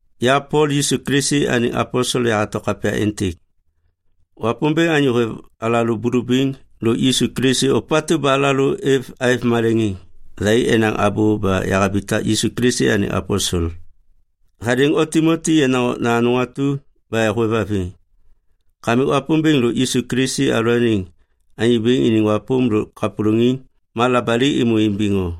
Ya Pol, Yisu Kilisi anêŋ aposel yahato kapya êntêk. Wapômbêŋ anyô hêv alalô bulubiŋ lôk Yisu Kilisi ôpatu ba alalô aêv maleŋiŋ, thai enaŋ abô ba yahabitak Yisu Kilisi anêŋ aposel. Hadêŋ o Timoti yenaŋ okna anôŋ atu ba hôêvhaviŋ. Kamik Wapômbêŋ lôk Yisu Kilisi alalôaniŋ Anyô Bêŋ iniŋ wapôm lôk kapôlôŋiŋ ma labali êmô imbiŋ o.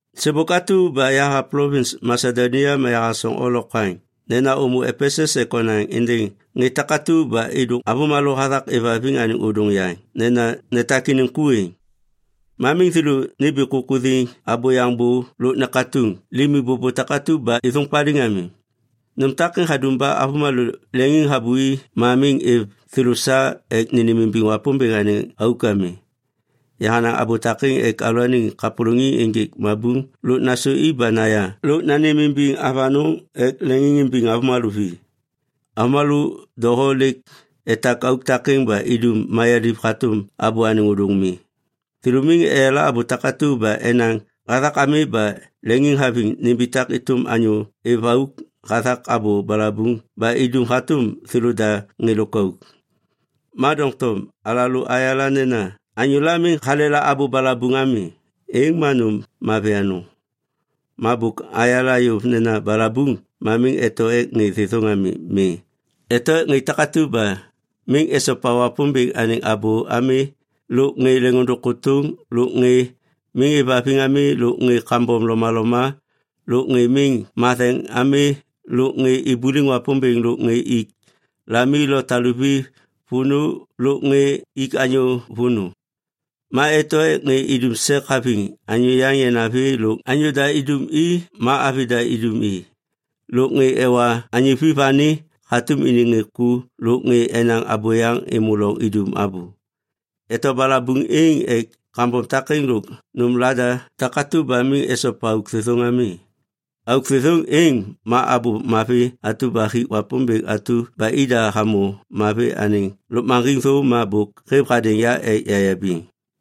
Sêbôk atu ba yaha plovins Masedonia ma yahasoŋ o lokwaŋ nena ômô Epesus ek onaŋ êndêŋ ŋê takatu ba êdôŋ avômalô hathak êvhaviŋ anêŋ ôdôŋ yaŋ nena netak iniŋ ku êŋ. Ma miŋ thêlô nimbi kukuthiŋ abôyaŋ bô lôk nekatuŋ limi bôbô takatu ba êthôŋ paliŋ ami. Nôm takêŋ hadum ba avômalô leŋiŋhabui ma miŋ hêv thêlô sa ek nênêmimbiŋ Wapômbêŋ anêŋ auk ami. Yahanaŋ abô takêŋ ek alalôaniŋ kapôlôŋiŋ ênjêk mabuŋ lôk nasôi ba naya lôk nanêmimbiŋ avanôŋ ek leŋiŋimbiŋ avômalô vi. Avômalô doho lêk etak auk takêŋ ba idum mayaliv hatôm abô anêŋ ôdôŋ mi. Thêlô miŋ eyala abô takatu ba enaŋ hathak ami ba leŋiŋhaviŋ nimbitak êtôm anyô êv auk hathak abô balabuŋ ba idum hatôm thêlôda ŋê lôkauk. Ma doŋtom alalô ayala nena anyôla miŋ halela abô balabuŋ ami, êŋ ma nôm mavi anôŋ. Ma bôk ayala yôv nena balabuŋ ma miŋ eto ek ŋê thêthôŋ ami. Mi. Eto ek ŋê takatu ba miŋ esopa Wapômbêŋ anêŋ abô ami lôk ŋê leŋôndôŋ kôtôŋ lôk ŋê miŋ êvhaviŋ ami lôk ŋê kambom lomaloma lôk ŋê miŋ matheŋ ami lôk ŋê ibuliŋ Wapômbêŋ lôk ŋê ik lami lo taluvi vônô lôk ŋê ik anyô vônô. Ma eto ek ŋê idum sek haviŋ anyô yaŋ yanavi lôk anyô da idum i ma avi da idum i, lôk ŋê ewa anyô vi vani hatôm iniŋ ŋê ku lôk ŋê enaŋ abôyaŋ êmô loŋ idum abô. Eto balabuŋ êŋ ek kambom takêŋ lôk nôm lada takatu ba miŋ esopa auk thêthôŋ ami. Auk thêthôŋ êŋ ma abô mavi atu ba hik Wapômbêŋ atu ba ida hamô mavi anêŋ lôkmaŋgiŋ thô ma bôk hêv hadêŋ ya ek yayabiŋ.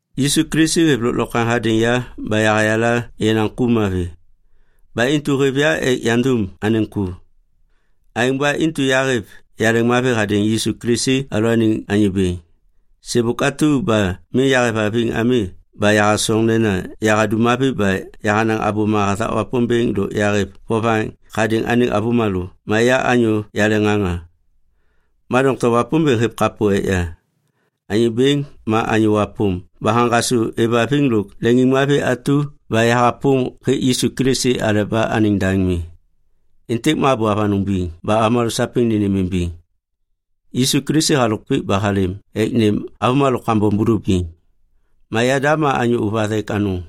Yisu Kilisi hêv lôklokwaŋ hadêŋ ya ba hayala yenaŋ ku mavi. Ba intu hêv ya ek yandum anêŋ ku. Aêŋ ba intu yahêv yaleŋmavi hadêŋ Yisu Kilisi alalôaniŋ Anyô Bêŋ. Sêbôk atu ba miŋ yahêvhaviŋ ami ba yahasoŋ nena yahadum mavi ba yahanaŋ abôma hathak Wapômbêŋ lôk yahêv vovaŋ hadêŋ anêŋ avômalô ma ya anyô yaleŋŋaŋa. Ma doŋtom Wapômbêŋ hêv kapô ek ya. Anyô Bêŋ ma anyô wapôm ba haŋgasô êvhaviŋ lôk leŋiŋmavi atu ba yahapôm hêk Yisu Kilisi aleba anêŋ daŋ mi. Êntêk ma abô avanôŋ biŋ ba avômalô sapêŋ nênêmimbiŋ. Yisu Kilisi halôk pik ba halêm ek nêm avômalô kambom bulubiŋ. Ma yada ma anyô ôvathek anôŋ.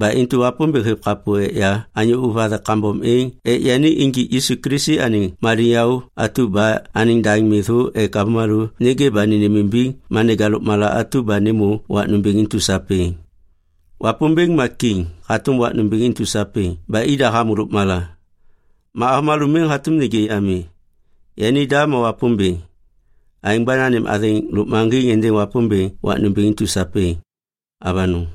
Ba intu Wapômbêŋ hêv kapô ek ya anyô ôvathek kambom êŋ ek yani injik Yisu Kilisi anêŋ maliŋyaô atu ba anêŋ daŋ mi thô ek avômalô nêgê ba nênêmimbiŋ ma neja lôkmala atu ba nêmô wak nômbêŋ intu sapêŋ. Wapômbêŋ ma kiŋ hatôm wak nômbêŋ intu sapêŋ ba ida hamô lôkmala. Ma avômalô miŋ hatôm nêgê ami. Yanida ma Wapômbêŋ. Aêŋ ba nanêm athêŋ lôkmaŋgiŋ êndêŋ Wapômbêŋ wak nômbêŋ intu sapêŋ. Avanôŋ.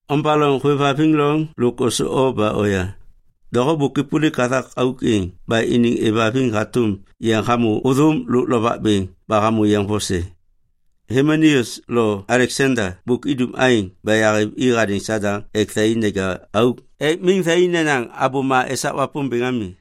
Ombaloŋ hôêvhaviŋ loŋ lôk ôsô o ba oya. Doho bôk êpôlik hathak auk êŋ ba iniŋ êvhaviŋ hatôm yeŋ hamô ôthôm lôk lovak bêŋ ba hamô yeŋ vose. Himeneus lo Aleksanda bôk idum aêŋ ba yahêv i hadêŋ Sadaŋ ek thai neja auk ek miŋ thai nenaŋ abôma esak Wapômbêŋ ami.